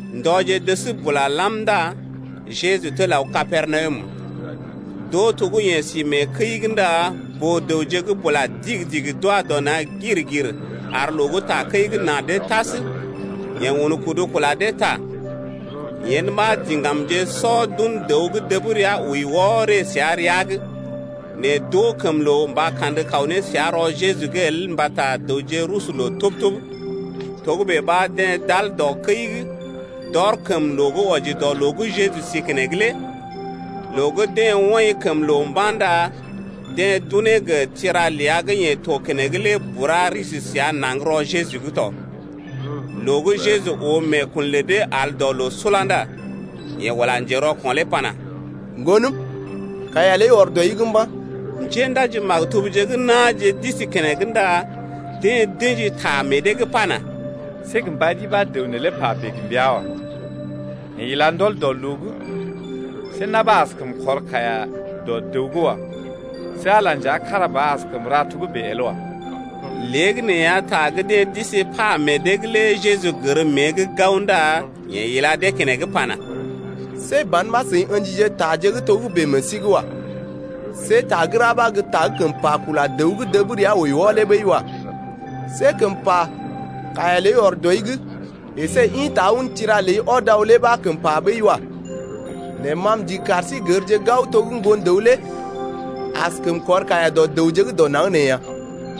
Ndɔje dəs bula lam ndá Jeju tel aw Kapernawum. D’oo to gə́ yeḛ si mee kəi’g ndá boo-dəwje gə́ bula digi-digi d’wa dɔ na̰ gir-gir ar loo gə́ takəi’g na dee tas. Yeḛ un kudu kula dee ta. Yen ɓa diŋgamje sɔ d’un dəw gə́ dəb rəa wəi wɔ ree səa rəa’g. Nɛ d’oo kəm loo mba kandə kaw ne səa rɔ Jeju’g el mbata dəwje rusu loo tub-tub. Togə́bè ɓa deḛ d’al tar dɔ kəi’g, d’ɔr kəm loo gə́ wɔji dɔ loo gə́ Jeju si keneŋ lé. Loo gə́ deḛ woḭ kəm loo mba̰ ndá deḛ d’unee gə tira ləa gə́ yeḛ to keneŋ lé bura risi səa naŋg rɔ Jeju’g tɔ. Loo gə́ Jeju oo meekun lə dee al dɔ loo sula ndá yeḛ ula njerɔko̰ lé pana: Ŋgonəm, kaiya ləi ɔr dɔi’g mba̰. Njéndaji-maktubje gə́ na̰je d’isi keneŋ ndá deḛ d’ə̰ji ta meḛ dee’g pana: See gə mba ri ɓa dəw neelé pa bèe gə mbəa wa. Yeḛ ila ndɔl dɔ loo’g. See na̰ ɓa askəm kɔr kaiya dɔ dəw’g wa. See Ala nja kára ba ɓa askəm ra togə́bè el wa. Léegəneeya ta gə́ deḛ d’isi pa meḛ dee’g lé Jeju gər mée’g gao ndá yeḛ ila dee keneŋ pana: See ban ɓa seḭ ə̰jije taje gə́ togə́bè meḛ sí’g wa. See ta gə́ ra ɓa gə́ ta gə́ kəm pa kula dəw gə́ dəb rəa wəi wɔ lé ɓəi wa. See kəm pa: Kaiya ɔr dɔi’g əsé ḭta un tira ləi ɔd aw lé ɓa kəm pa ɓəi wa. Nɛ ma m’ndigi kar sí gərje gao to gə́ Ŋgon-dəw lé askəm kɔr kaiya dɔ dəwje gə́ dɔ naŋg nee ya.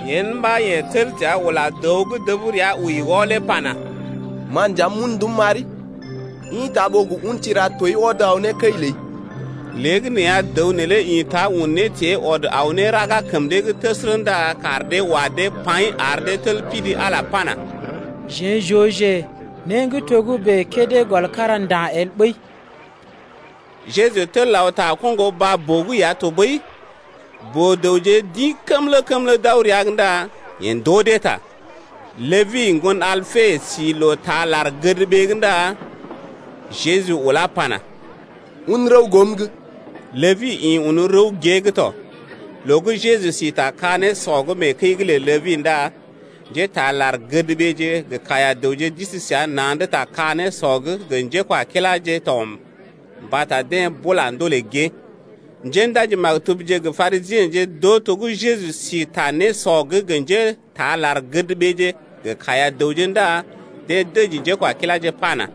Yen ɓa yeḛ tel təa ula dəw gə́ dəb rəa wəi wɔ lé pana: Ma nja m’un ndum m’ari, ḭta ɓó gə un tira tooi ɔd aw ne kəi ləi. Léegəneeya dəw neelé ḭta un nétée ɔd aw ne raga kəm dee’g təsərə ndá kaar dee wa dee paḭ ar dee tel pidi Ala pana: Jeḛ j’ooje né gə́ togə́bè kédé gɔl kára nda̰ el ɓəi. Jeju tel aw ta koŋgo baa-boo’g ya tɔɓəi. Boo-dəwje d’ḭ kəmlə-kəmlə d’aw rəa’g ndá yeḛ ndoo dee ta. Ləbi, ŋgon Alpe si loo taa lar-gədɓee’g ndá Jeju ulá pana: Un rəw goom’g. Ləbi ḭ un rəw gée’g tɔ. Loo gə́ Jeju si ta ka-nésɔ’g mee kəi’g lə Ləbi ndá njétaa lar-gədɓeeje gə kaiya-dəwje d’isi səa na̰’d ta ka-nésɔ’g gə njékwakiláje to mbata deḛ bula ndolè gée. Njéndaji-maktubje gə Parisiḛje d’oo to gə́ Jeju si ta nésɔ’g gə njétaa lar-gədɓeeje gə kaiya-dəwje ndá deḛ dəji njékwakiláje pana: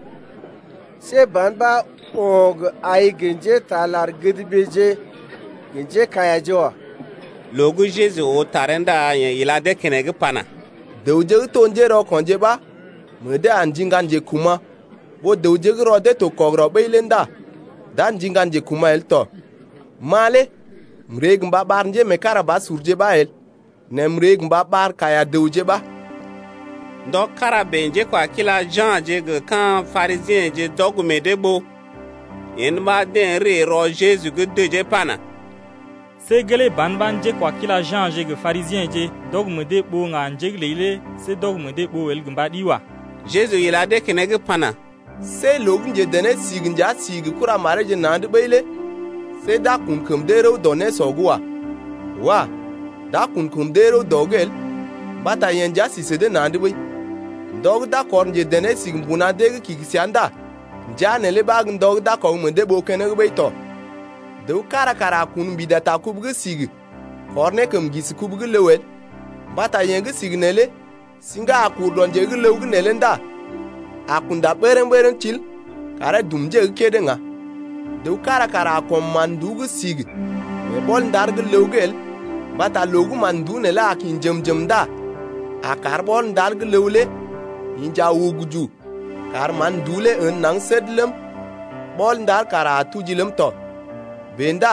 See ban ɓa yeḛ o̰ gə ai gə njétaa lar-gədɓeeje gə njékaiyaje wa. Loo gə́ Jeju oo taree ndá yeḛ ila dee keneŋ pana: Dəwje gə́ to njérɔko̰je ɓa meḛ dee a ndiŋga njekuma̰ ɓó dəwje gə́ rɔ dee to kɔgərɔ ɓəi lé ndá d’a ndiŋga njekuma̰ el tɔ. Ma lé m’ree gə mba ɓar njémeekarabasurje ɓa el, nɛ m’ree gə mba ɓar kaiya-dəwje ɓa. Ndɔ kára bèe njékwakila Ja̰je gə ka̰ Parisiḛje d’ɔg meḛ dee ɓoo. Yen ɓa deḛ ree rɔ Jeju’g dəjee pana: See gelee ban ɓa njékwakila Ja̰je gə Parisiḛje d’ɔg meḛ dee ɓoo ŋga njé’g ləi lé see d’ɔg meḛ dee ɓoo el gə mba ɗi wa. Jeju ila dee keneŋ pana: See loo gə́ njedené-sigi nja si gə kuramareeje na̰’d ɓəi lé see d’a kun kəm dee rəw dɔ nésɔ’g wa. Wah! d’a kun kəm dee rəw dɔ’g el mbata yeḛ nja si sə dee na̰’d ɓəi. Ndɔ gə́ d’a kɔr njedené-sigi mbuna dee’g kigi səa ndá ndəa neelé ɓa gə́ ndɔ gə́ d’a gə kɔg meḛ dee ɓoo keneŋ ɓəi tɔ. Dəw kára kara a kun mbida ta kubu gə́ sigi kɔr ne kəm ŋgisi kubu el, mbata yee gə́ sigi neelé siŋga a kur dɔ nje gə́ ləw gə́ neelé ndá a kunda bərəŋ-bərəŋ til karee dum nje gə́ kédé ŋga. Dəw kára kara a kɔm mán-nduú gə́ sigi mee ɓɔl-ndar gə́ ləw’g el mbata loo gə́ mán-nduú neelé a kḭ njem-njem ndá a kar ɓɔl-ndar gə́ ləw lé inja uguju kar mán-nduú lé ən naŋg səd ləm, ɓɔl-ndar kara a tuji ləm tɔ. Bèe ndá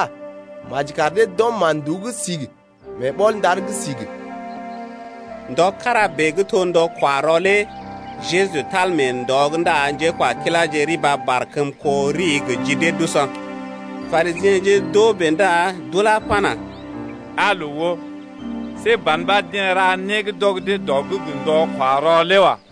maji kar dee d’ɔm mán-nduú gə́ sigi mee ɓɔl-ndar gə́ sigi. Ndɔ kára bèe gə́ to ndɔ-kwa-rɔ lé Jeju tal mee ndɔ’g ndá njékwakiláje riba barkəm kó rii gə ji dee d’usɔ. Parisiḛje d’oo bèe ndá d’ulá pana: Aa loo oo, see ban ɓa deḛ ra né gə́ d’ɔg dee dɔ’g gə ndɔ-kwa-rɔ lé wa.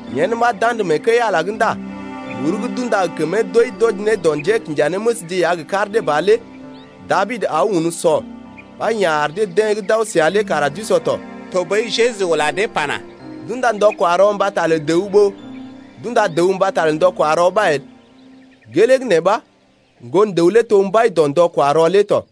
Yen ɓa d’andə mee kəi-Ala’g ndá muru gə́ d’unda gə kəmee doi d’wɔji ne dɔ njékinjanéməsje ya gə kar dee ba lé Dabid aw un o̰ ɓa ya̰ ar deḛ gə́ d’aw səa lé kara d’o̰ tɔ. Tɔɓəi Jeju ula dee pana: D’unda ndɔ-kwa-rɔ mbata lə dəw ɓó d’unda dəw mbata lə ndɔ-kwa-rɔ ɓa el. Gelee gə́ nee ɓa Ŋgon-dəw lé to mbai dɔ ndɔ-kwa-rɔ lé tɔ.